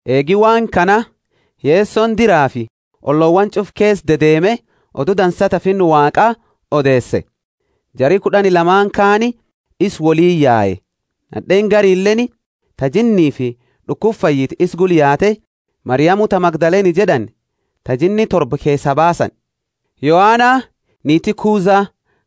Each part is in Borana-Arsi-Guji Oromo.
Eegi waan kana Yesoni diraafi ollowaani ch'ufa keesa dedeeme Odu Dansa ta Finna Waaqa odeese. Jari kud'ani lamaani kaani isaani woliini yae, nad'eeni garileeni ta jinniifi d'ukuba fayyite isa gula yaate Mariamu ta Magdalene jed'ani ta jinni torba keesaa baasani; Yoana, niiti Kuza,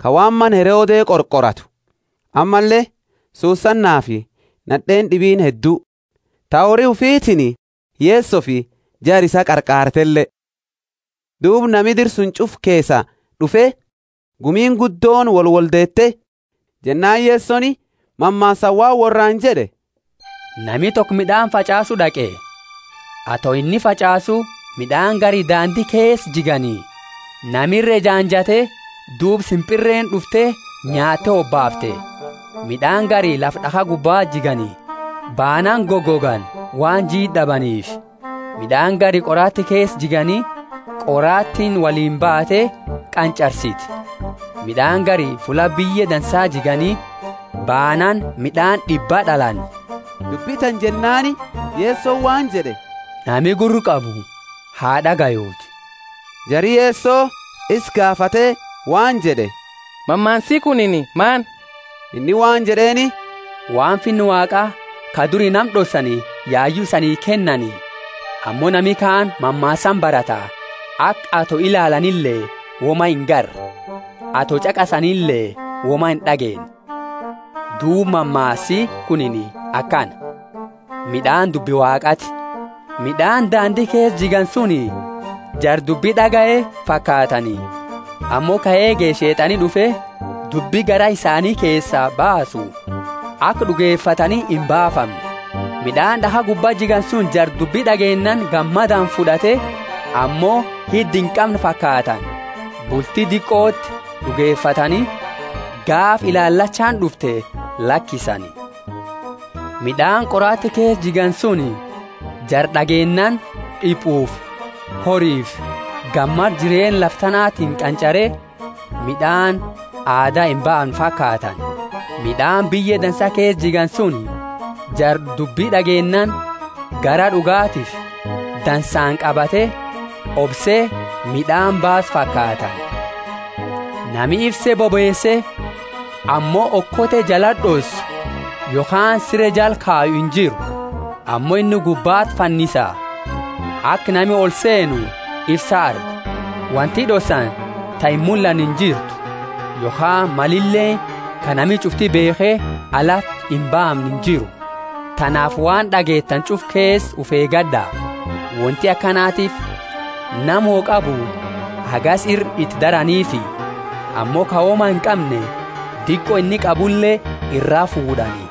ka waan mana Herode qorqoratu, ammalle Susanafi nad'eeni d'ibiini heddu, ta hori ufitiini Yesofi jara isaa qarqaartele. Duuba nami dira ch'ufa keesaa d'ufe, gumiini guddooni wolwoldeete. Jennaani Yesoni mammaasaani waan worraani jed'e: Nami toko mid'aani fach'aasu d'aqe. Ato inni fach'aasu mid'aani gari daandi keesa jigani, nami ira ejaanjate duuba simpirreeni d'ufte nyaatte hobaafte. Mid'aani gari lafa d'akha gubba jigani, baanaani gogogani waan jiid'a d'abaniifi. Mid'aani gari qorati keesa jigani, qoratiini woliini baate qanch'arsite. Mid'aani gari fulla biyye dansa jigani, baanaani mid'aani d'ibbaa d'alani. Dubbi tana jennaani Yesoni waan jed'e, Nami gurra qabu ha d'agayuuti. Jari Yeso isa gaafate waan jed'e, Mammaasi kunini maani? Inni waan jed'eeni, Waan Finna Waaqa ka duri nama d'ossani yayu isanii kennani; ammo nami kaani mammaasaani barata, aka ato ilaalanile woma inagarre, ato ch'aqasanile woma ind'ageenne. Duuba mammaasi kunini akana; mid'aani dubbi Waaqaati. Mid'aani daandi keesa jigani suni jara dubbi d'agaye fakaatani, ammo ka eege Sheet'ani d'ufe dubbi garaa isaani keesaa baasu, aka d'ugefatani imbaafamne. Mid'aani d'akha gubba jigani suni jara dubbi d'ageennaani gammadaani fud'ate, ammo hidda inqamne fakaatani. Bulti diqoti d'ugefatani, gaafa ilaalachaani d'ufte lakisani. Mid'aani qorati keesa jigani suni jara d'ageennaani d'ipufi horifi gammada jireenna lafa tanatiini qanch'are mid'aani aada imbaamne fakaatani. Mid'aani biyye dansa keesa jigani suni jara dubbi d'ageennaani garaa d'ugatiifi dansaani qabate obse mid'aani baasu fakaatani. Nami ifse bobeese ammo okote jalati d'ossu yokhaani sire jala kayu injiru. Ammo inni gubbati fannisa aka nami olseenu ifsa argu. Wonti d'ossani ta imullanne injirtu, yokhaani malileeni ka nami ch'ufti beekhe alati imbaamne injiru. Tanaafi waan d'ageetani ch'ufa keesa ufi eegad'a. Wonti akanatiifi, nama wo qabu hagasi ira iti daraniifi, ammo ka woma inqamne diqo inni qabule iraa fuud'ani.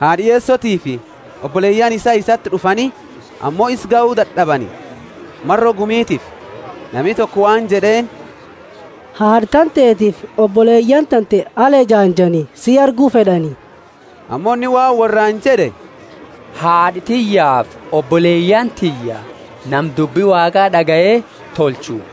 Haad'a Yesotiifi oboleyaani isaa isati d'ufani ammo isa gahu dad'abani, maro gumitiifi. Nami toko waan jed'eeni, Haad'a tantetiifi oboleyaani tante ala ejaanjani si argu fed'ani. Ammo inni waan worraani jed'e, Haad'a tiyyaafi oboleyaani tiyya nama dubbi Waaqa d'agaye tolchu.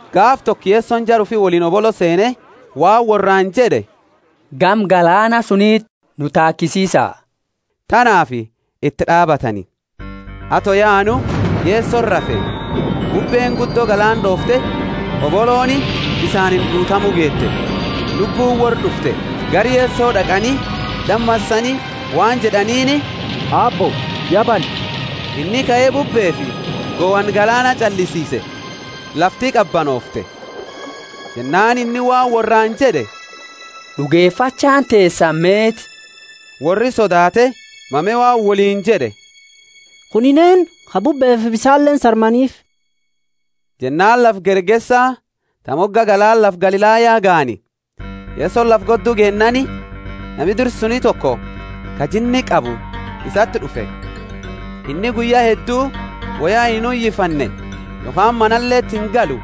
Gaafa toko Yesoni jara ufi woliini hobolo seene waan worraani jed'e, Gama galaana suniti nu taakisiisa. Tanaafi iti d'aabatani. Ato yaanu Yesoni rafe. Bubbeeni guddo galaana d'oofte, hobolooni bisaaniini guutamu geete, lubbuuni worra d'ufte. Gara Yeso d'aqani damasani waan jed'aniini, Aabbo, ya banne. Inni kae bubbeefi gohanna galaana ch'allisiise, lafti qabanoofte. Jennaani inni waan worraani jed'e, D'ugefachaani teesani meeti? Worri sodaate, mame waan woliini jed'e, Kunini eennu, ka bubbeefi bisaaleeni sarmaniifi? Jennaani lafa Gergesa ta moga galaana lafa Galilaya gahani. Yesoni lafa goddu geennaani, nami dira suni toko, ka jinni qabu, isati d'ufe. Inni guyya heddu woya inuyifanne yokhaani manaleti ingalu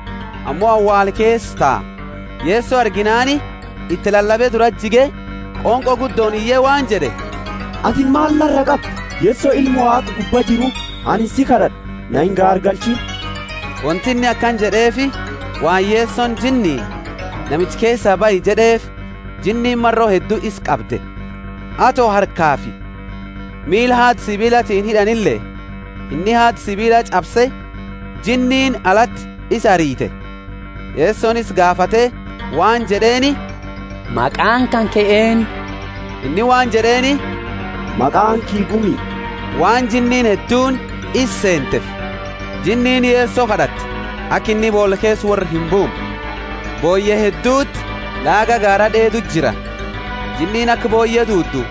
ammo awaala keesa taa. Yeso arginaani iti lalabe durati jige qonqo guddooni iye waan jed'e, Ati maal nara qabda, Yeso Ilma Waaqa Gubba Jiru? Anini si kad'ad'a, na ingaargalchiini. Wonti inni akana jed'eefi waan Yesoni jinniini, Namicha keesaa bahi jed'eefi jinniini maro heddu isa qabde; ato harkafi miila haada sibiilatiini hid'anile inni haada sibiila ch'abse, jinniini alati isa arite. Yesoni isa gaafate waan jed'eeni, Maqaani kanke eennu? Inni waan jed'eeni, Maqaani kiyya Gumi, waan jinniini hedduuni isa seenteefi. Jinniini Yeso kad'atte aka inni boola keesa worra imbuumne. Booyye hedduti laaga gaara d'eedu jira. Jinniini aka booyye duudu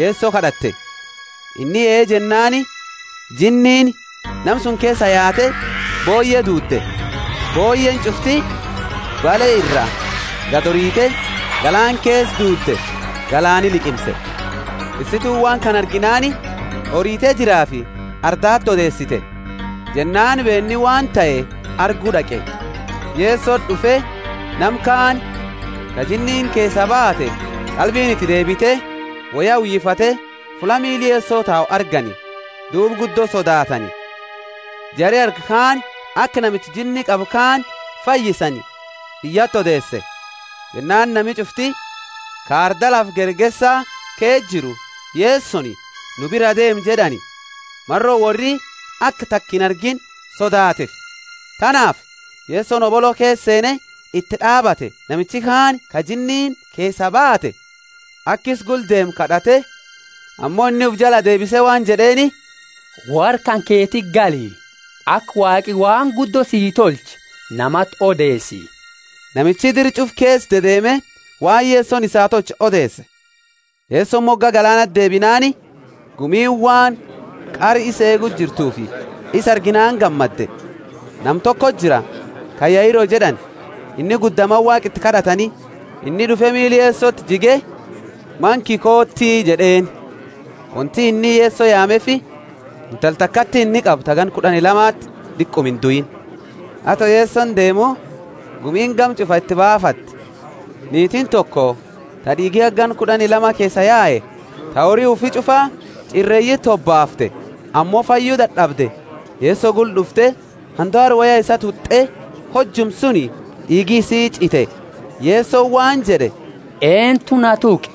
Yeso kad'atte. Inni, Ee jennaani jinniini nama suni keesaa yaate booyye duude, booyyeeni ch'ufti bale ira gadi orite galaana keesa duude, galaani liqimse. Tissituuni waan kana arginaani orite diraafi ardaati odeesite. Jennaani beenni waan tahe argu d'aqe, Yesoti d'ufe, nama kaani ka jinniini keesaa baate qalbiini iti deebite woya uyifate fulla miila Yeso tau argani. Duuba guddo sodaatani. Jari arge kaani aka namicha jinni qabu kaani fayyisani biyyati odeese. Jennaani nami ch'ufti ka arda lafa Gergesa keesa jiru Yesoni, Nu biraa deemi jed'ani, maro worri aka taka inargiini sodaateefi. Tanaafi Yesoni hobolo keesa seene iti d'aabate. Namichi kaani, ka jinniini keesaa baate, aka isa gula deemu kad'ate, ammo inni ufi jalaa deebise waan jed'eeni, Worra kanketiti gali, aka Waaqi waan guddo sii tolche namati odeesi. Namichi dira ch'ufa keesa dedeeme waan Yesoni isaa tolche odeese. Yesoni moga galaanati deebinaani, gumiini Waan qara isa eegu jirtuufi isa arginaani gammade. Nama tokoti jira, ka Yairo jed'ani, inni gudda mana Waaqa iti kad'atani. Inni d'ufe miila Yesoti jige, Mana kiyya kooti jed'eeni. Wonti inni Yeso yaameefi intala takati inni qabu ta ganna kud'ani lamati diquma induini. Ato Yesoni deemu, gumiini gama ch'ufa iti baafate. Niitiini toko ta d'iigi haga ganna kud'ani lama keesaa yae, ta hori ufi ch'ufa ch'ireeyiti hobaafte, ammo fayyu dad'abde, Yeso gula d'ufte handaara woya isaa tut'e; hojuma suni d'iigi isii ch'ite. Yesoni waan jed'e, Eentu na tuqe?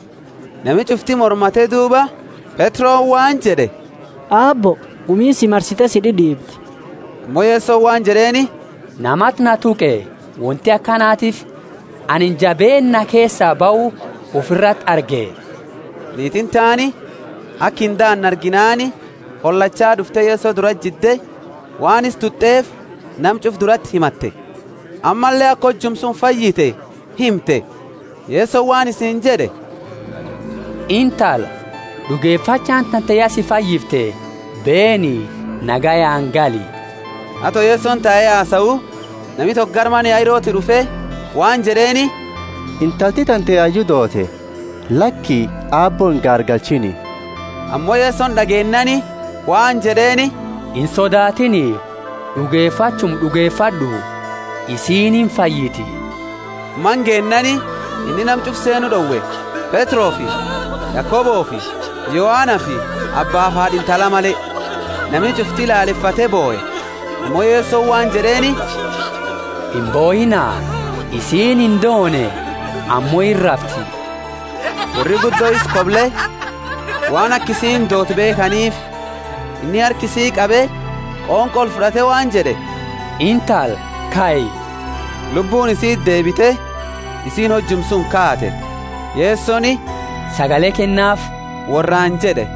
Nami ch'ufti mormate duuba Petroni waan jed'e, Aabbo, gumiini si marsite si d'id'iibdi. Ammo Yesoni waan jed'eeni, Namati na tuqe, wonti akanatiifi anini jabeenna na keesaa bahu ufirati arge. Niitiini taani aka indaane arginaani holachaa d'ufte Yeso durati jidde waan isa tut'eefi nama ch'ufa durati himatte, ammalle aka hojuma suni fayyite himte. Yesoni waan isiini jed'e, Intala, d'ugefachaani tante ya si fayyifte, beeni, nagayaani gali. Ato Yesoni tae hasau, nami toko gara mana Yairoti d'ufe waan jed'eeni, Intalti tante yayu doote, laki, Aabbo ingaargalchiini. Ammo Yeso d'ageennaani waan jed'eeni, Insodaatini, d'ugefachuma d'ugefad'u, isiini imfayiti. Mana geennaani inni nama ch'ufa seenu d'owe, Petrofi Yakobofi Yohanafi abbaafi haad'a intala male. Nami ch'ufti laalefate bohe, ammo Yesoni waan jed'eeni, Imbohiina, isiini indoone ammo irrafti. Worri guddo isa koble waan aka isiini doote beekhaniifi. Inni harka isii qabe qonqo olfud'ate waan jed'e, Intala, kai. Lubbuuni isiti deebite, isiini hojuma suni kaate. Yesoni, Sagale kennaafi worraani jed'e.